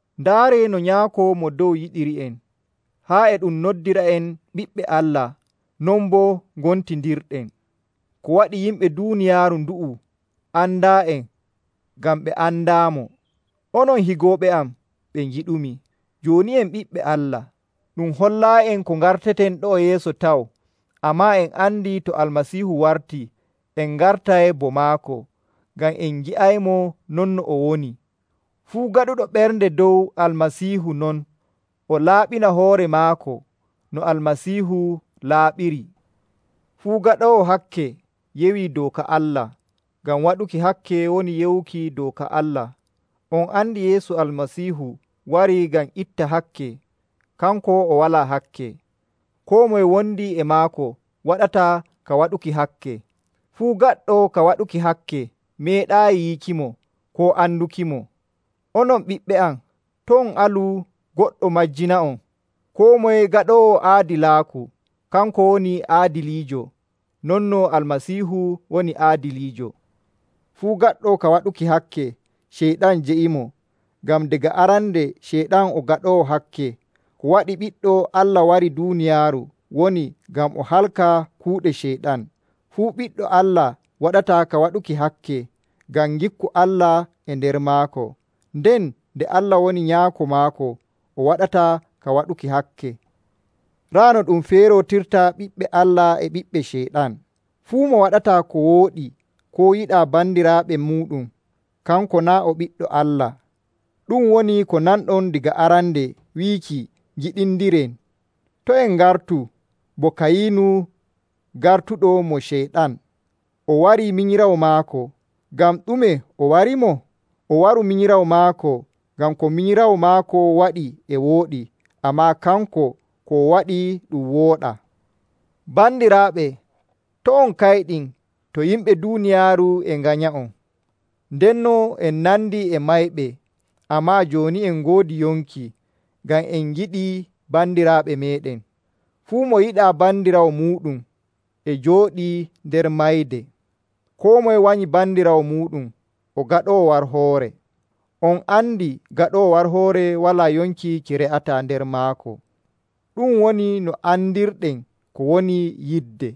Ndaaree no Nyaako Mo Dow yiɗiri'en, haa e ɗum noddira'en ɓiɓɓe Allah, non boo ngontindirɗen. Ko waɗi yimɓe duuniyaaru ndu'u andaa'en ngam ɓe andaamo. Onon higooɓe am ɓe ngiɗumi, jooni en ɓiɓɓe Allah. Ɗum hollaayi'en ko ngarteten ɗo'o yeeso taw. Ammaa en andi to Almasiihu wartii, en ngartay bo maako, ngam en ngi'aymo non no o woni. Fuu gaɗuɗo ɓernde dow Almasiihu non, o laaɓina hoore maako no Almasiihu laaɓiri. Fuu gaɗoowo hakke yewii dooka Allah, ngam waɗuki hakke woni yewuki dooka Allah. On andi Yeesu Almasiihu warii ngam itta hakke. Kanko o walaa hakke. Koo moye wondi e maako waɗataa ka waɗuki hakke. Fuu gaɗɗo ka waɗuki hakke meeɗaayi yiikimo koo andukimo. Onon ɓiɓɓe am, to' on alu goɗɗo majjina'on. Koo moye gaɗoowo aadilaaku, kanko woni aadiliijo non no Almasiihu woni Aadiliijo. Fuu gaɗɗo ka waɗuki hakke, Ceyɗan jeyimo, ngam daga arande Ceyɗan o gaɗoowo hakke. Ko waɗi Ɓiɗɗo Allah wari duuniyaaru woni ngam o halka kuuɗe Ceyɗan. Fuu ɓiɗɗo Allah waɗataa ka waɗuki hakke, ngam ngikku Allah e nder maako. Nden nde Allah woni Nyaako maako, o waɗataa ka waɗuki hakke. Raa no ɗum feerootirta ɓiɓɓe Allah e ɓiɓɓe Ceyɗan. Fuu mo waɗataa ko wooɗi koo yiɗaa bandiraaɓe muuɗum, kanko naa' o ɓiɗɗo Allah. Ɗu'um woni ko nanɗon daga arande wiiki ngiɗindiren. To' en ngartu bo Kayinu gartuɗo mo Ceyɗan, o wari minyiraawo maako. Ngam ɗume o warimo? O waru minyiraawo maako ngam ko minyiraawo maako waɗi e wooɗi, ammaa kanko, ko o waɗi ɗum wooɗaa. Bandiraaɓe, to' on kayɗin to yimɓe duuniyaaru e nganya'on. Ndenno en nandi e mayɓe, ammaa jooni en ngoodi yonki, ngam en ngiɗi bandiraaɓe meeɗen. Fuu mo yiɗaa bandiraawo muuɗum e jooɗii nder mayde. Koo moye wanyi bandiraawo muuɗum o gaɗoowo warhoore. On andi gaɗoowo warhoore walaa yonki ki re'ataa nder maako. Ɗu'um woni no andirɗen ko woni yidde: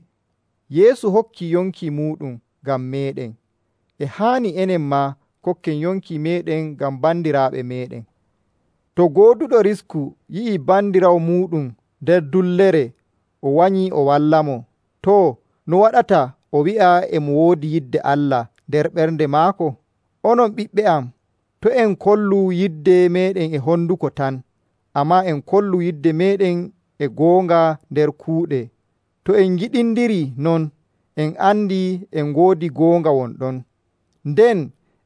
Yeesu hokkii yonki muuɗum ngam meeɗen. E haani enen maa kokken yonki meeɗen ngam bandiraaɓe meeɗen. To gooduɗo risku yi'ii bandiraawo muuɗum nder dullere o wanyii o wallamo, too, no waɗata o wi'a e mo woodi yidde Allah nder ɓernde maako? Onon ɓiɓɓe am, to' en kollu yidde meeɗen e honduko tan, ammaa en kollu yidde meeɗen e goonga nder kuuɗe. To en ngiɗindirii non, en andi en ngoodi goonga won ɗon. Nden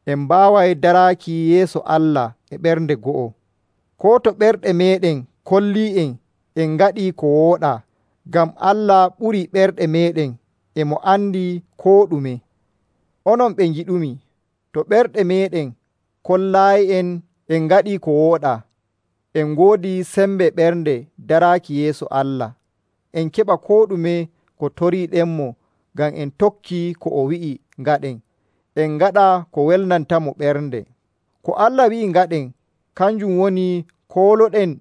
en mbaaway daraaki yeeso Allah e ɓernde go'o, koo to ɓerɗe meeɗen kollii'en en ngaɗii ko wooɗaa. Ngam Allah ɓurii ɓerɗe meeɗen, e mo andi koo ɗume. Onon ɓe ngiɗumi, to ɓerɗe meeɗen kollaayi'en en ngaɗii ko wooɗaa, en ngoodi sembe ɓerɗe daraaki yeeso Allah. En keɓa koo ɗume ko toriiɗenmo ngam en tokkii ko o wi'i ngaɗen, en ngaɗa ko welnantamo ɓernde. Ko Allah wi'i ngaɗen, kanjum woni koolooɗen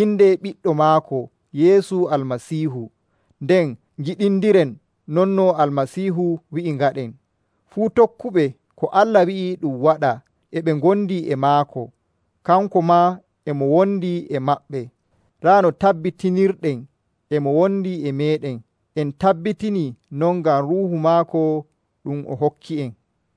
inde Ɓiɗɗo maako Yeesu Almasiihu, nden ngiɗindiren non no Almasiihu wi'i ngaɗen. Fuu tokkuɓe ko Allah wi'i ɗum waɗa e ɓe ngondi e maako, kanko maa e mo wondi e maɓɓe. Raa no tabbitinirɗen e mo wondi e meeɗen: en tabbitinii non ngam Ruuhu maako ɗum o hokki'en.